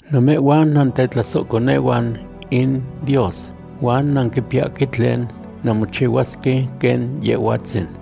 Namehhuan nantetlasohconehuan in Dios, huan nanquipiyahque tlen nanmochihuasque quen Yehhuatzin.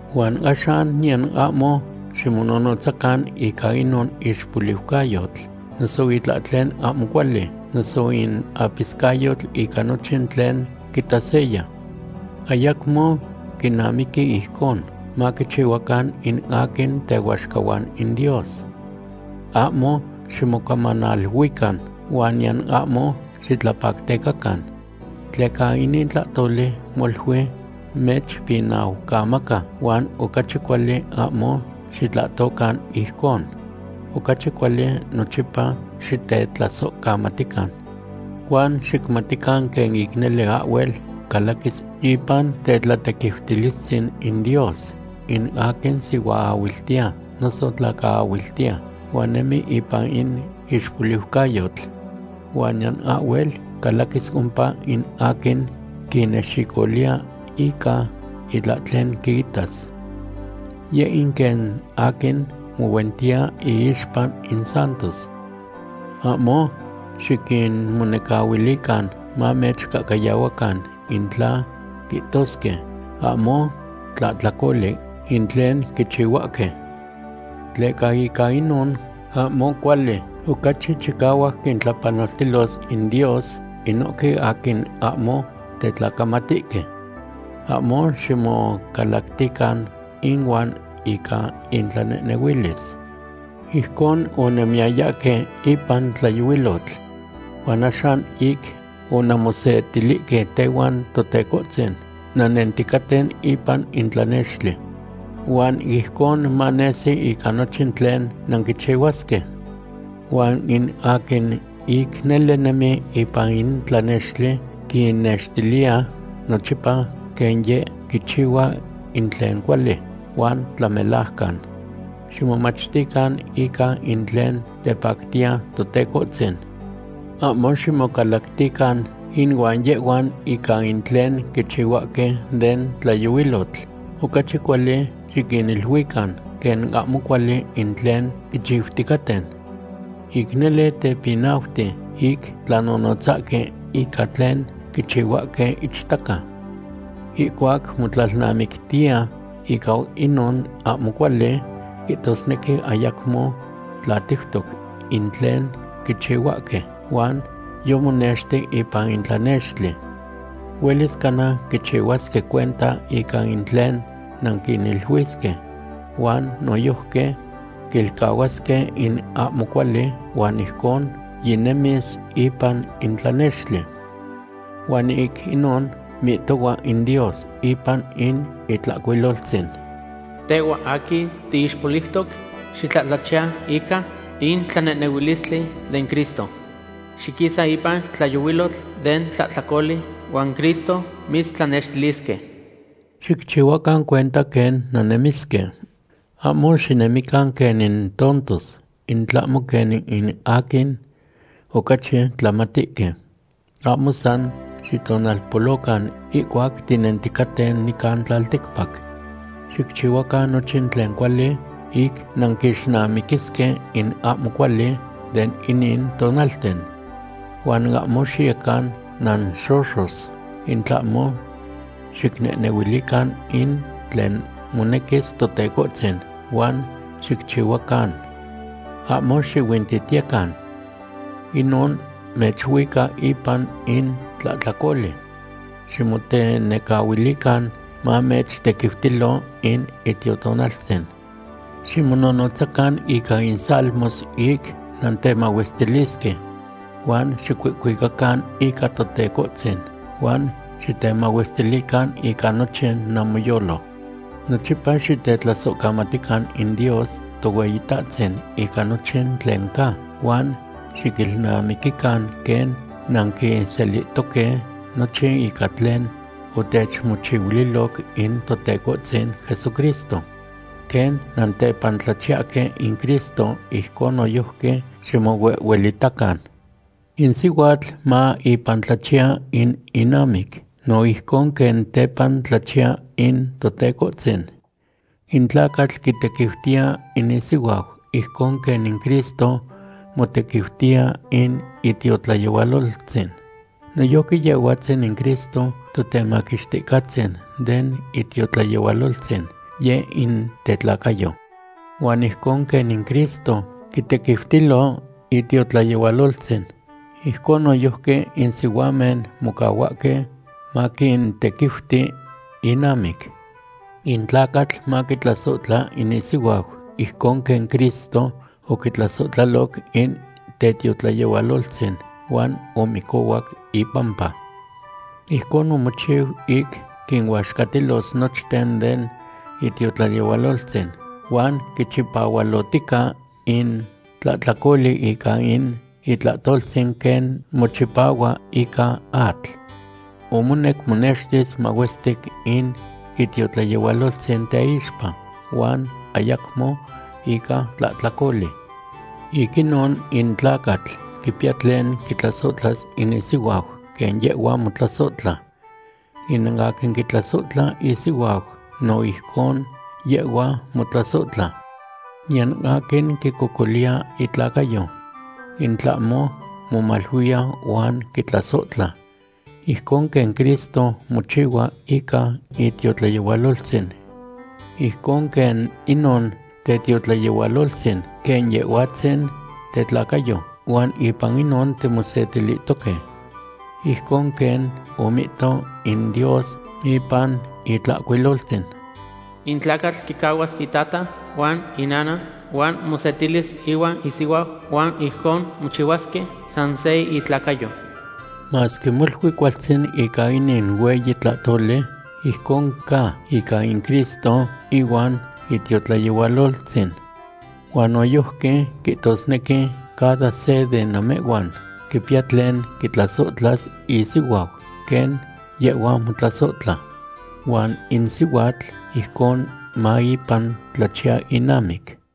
Huan axan niyan ahmo ximonohnotzacan ica inon ixpoliucayotl, noso itlahtlen ahmo cuali, noso in apiscayotl ica nochin tlen quitas seya. Ayacmo quinamiqui ijcon maquichihuacan in aquin tehuaxcahuan in Dios. Ahmo ximocamanaluican huan niyan ahmo xitlapactecacan. Tleca inin tlahtoli molui mechpinaumaca huan ocachi cuali ahmo xitlahtocan ijcon. Ocachi cuali nochipa xitetlasohcamatican. Huan xicmatican quen ic nele ahhuel calaquis ipan tetlatequiutilistzin in Dios in aquin sihuaahuiltiya noso tlacaahuiltiya, huan nemi ipan in ixpoliucayotl. Huan niyan ahhuel calaquis ompa in aquin quinexicoliya ica itlahtlen quitas. Yeh in quen aquin mohuentiya iixpa in santos. Ahmo xiquinmonecahuilican mamechcahcayahuacan in tla quihtosque ahmo tlahtlacoli in tlen quichihuahque. Tleca ica inon ahmo cuali ocachi chicahuac quintlapanoltilos in Dios inohque aquin ahmo tetlacamatihque. Ahmo ximocalactican inuan ica intlanehnehuilis. Ijcon onannemiyayahque ipan tlayohuilotl. Huan axan ic onanmosetilihque tehuan Totecohtzin, nannenticaten ipan in tlanextli. Huan ijcon manesi ica nochin tlen nanquichihuasque. Huan in aquin ic nele nemi ipan in tlanextli quinnextiliya nochipa quen yeh quichihua in tlen cuali huan tlamelajcan. Ximomachtican ica in tlen tepactiya Totecohtzin. Ahmo ximocalactican inuan yehhuan ica in tlen quichihuahque den tlayohuilotl. Ocachi cuali xiquiniluican quen ahmo cuali in tlen quichiuticaten. Ic nele tepinauti ic tlanonotzahque ica tlen quichihuahque ichtaca. Ihcuac motlalnamictiya ica inon ahmo cuali, quihtosnequi ayacmo tlatiutoc in tlen quichihuahque huan yomonexti ipan in tlanextli. Huelis cana quichihuasque cuenta ica in tlen nanquiniluisque huan noyojqui quilcahuasque in ahmo cuali huan ijcon yinemis ipan in tlanextli. Huan ic inon mihtohua in Dios ipan in Itlahcuiloltzin: Tehhua aquin tiixpoliutoc, xitlahtlachiya ica in tlanehnehuilistli den Cristo. Xiquisa ipan tlayohuilotl den tlahtlacoli huan Cristo mitztlanextilisque. Xicchihuacan cuenta quen nannemisque. Ahmo xinemican quen in tontos, in tlahmo quen in aquin ocachi tlamatihque. Ahmo san xitonalpolocan ihcuac tinenticaten nican tlalticpac. Xicchihuacan nochin tlen cuali ic nanquixnamiquisque in ahmo cuali de inin tonalten. Huan ahmo xiyecan nanxoxos, in tlahmo xicnehnehuilican in tlen monequis Totecohtzin, huan xicchihuacan. Ahmo xihuintitiyecan. Inon mechuica ipan in tlahtlacoli. Xitemonecahuilican mamechtequiutilo in Itiotonaltzin. Ximonohnotzacan ica in salmos ic nantemahuestilisque, huan xicuihcuicacan ica Totecohtzin, huan xitemahuestilican ica nochin namoyolo. Nochipa xitetlasohcamatican in Dios Tohueyitahtzin ica nochin tlen ca, huan xiquilnamiquican quen nanquiselihtoque nochin ica tlen otechmochihuiloc in Totecohtzin Jesucristo. Quen nantepantlachiyahque in Cristo, ijcon noyojqui ximohuehuelitacan. In sihuatl ma ipan tlachiya in inamic no ijcon quen tepan tlachiya in Totecohtzin. In tlacatl quitequiutiya in isihuau, ijcon quen in Cristo motequiutiya in itiotlayehualoltzin. Noyojqui Yehhuatzin in Cristo Totemaquixticahtzin den itiotlayehualoltzin, yeh in tetlacayo. Huan ijcon quen in Cristo quitequiutilo itiotlayehualoltzin, ijcon noyojqui in sihuamen mocahuahque maquintequiuti innamic. In tlacatl maquitlasohtla in isihuau ijcon quen Cristo oquitlasohtlaloc in tetiotlayehualoltzin, huan omicohuac ipampa. Ijcon omochiu ic quinuaxcatilos nochten den itiotlayehualoltzin huan quichipahualohtica in tlahtlacoli ica in itlahtoltzin quen mochipahua ica atl. Omonec monextis mahuestic in itiotlayehualoltzin teixpa, huan ayacmo ica tlahtlacoli. Ic inon in tlacatl quipiya tlen quitlasohtlas in isihuau quen yehhua motlasohtla. In aquin quitlasohtla isihuau, no ijcon yehhua motlasohtla. Niyan aquin quicocoliya itlacayo, in tlahmo momaluiya huan quitlasohtla, ijcon quen Cristo mochihua ica itiotlayehualoltzin. Ijcon quen inon tetiotlayehualoltzin quen Yehhuatzin tetlacayo, huan ipan inon timosetilihtoque. Ijcon quen omihto in Dios ipan Itlahcuiloltzin: “In tlacatl quicahuas itata huan inana huan mosetilis ihuan isihuau, huan ijcon mochihuasque san se intlacayo.” Masque molui cualtzin ca inin hueyi tlahtoli, ijcon ca ica in Cristo ihuan itiotlayehualoltzin. Huan noyojqui quihtosnequi cada se de namehhuan quipiya tlen quitlasohtlas isihuau quen yehhua motlasohtla. Huan in sihuatl ijcon ma ipan tlachiya inamic.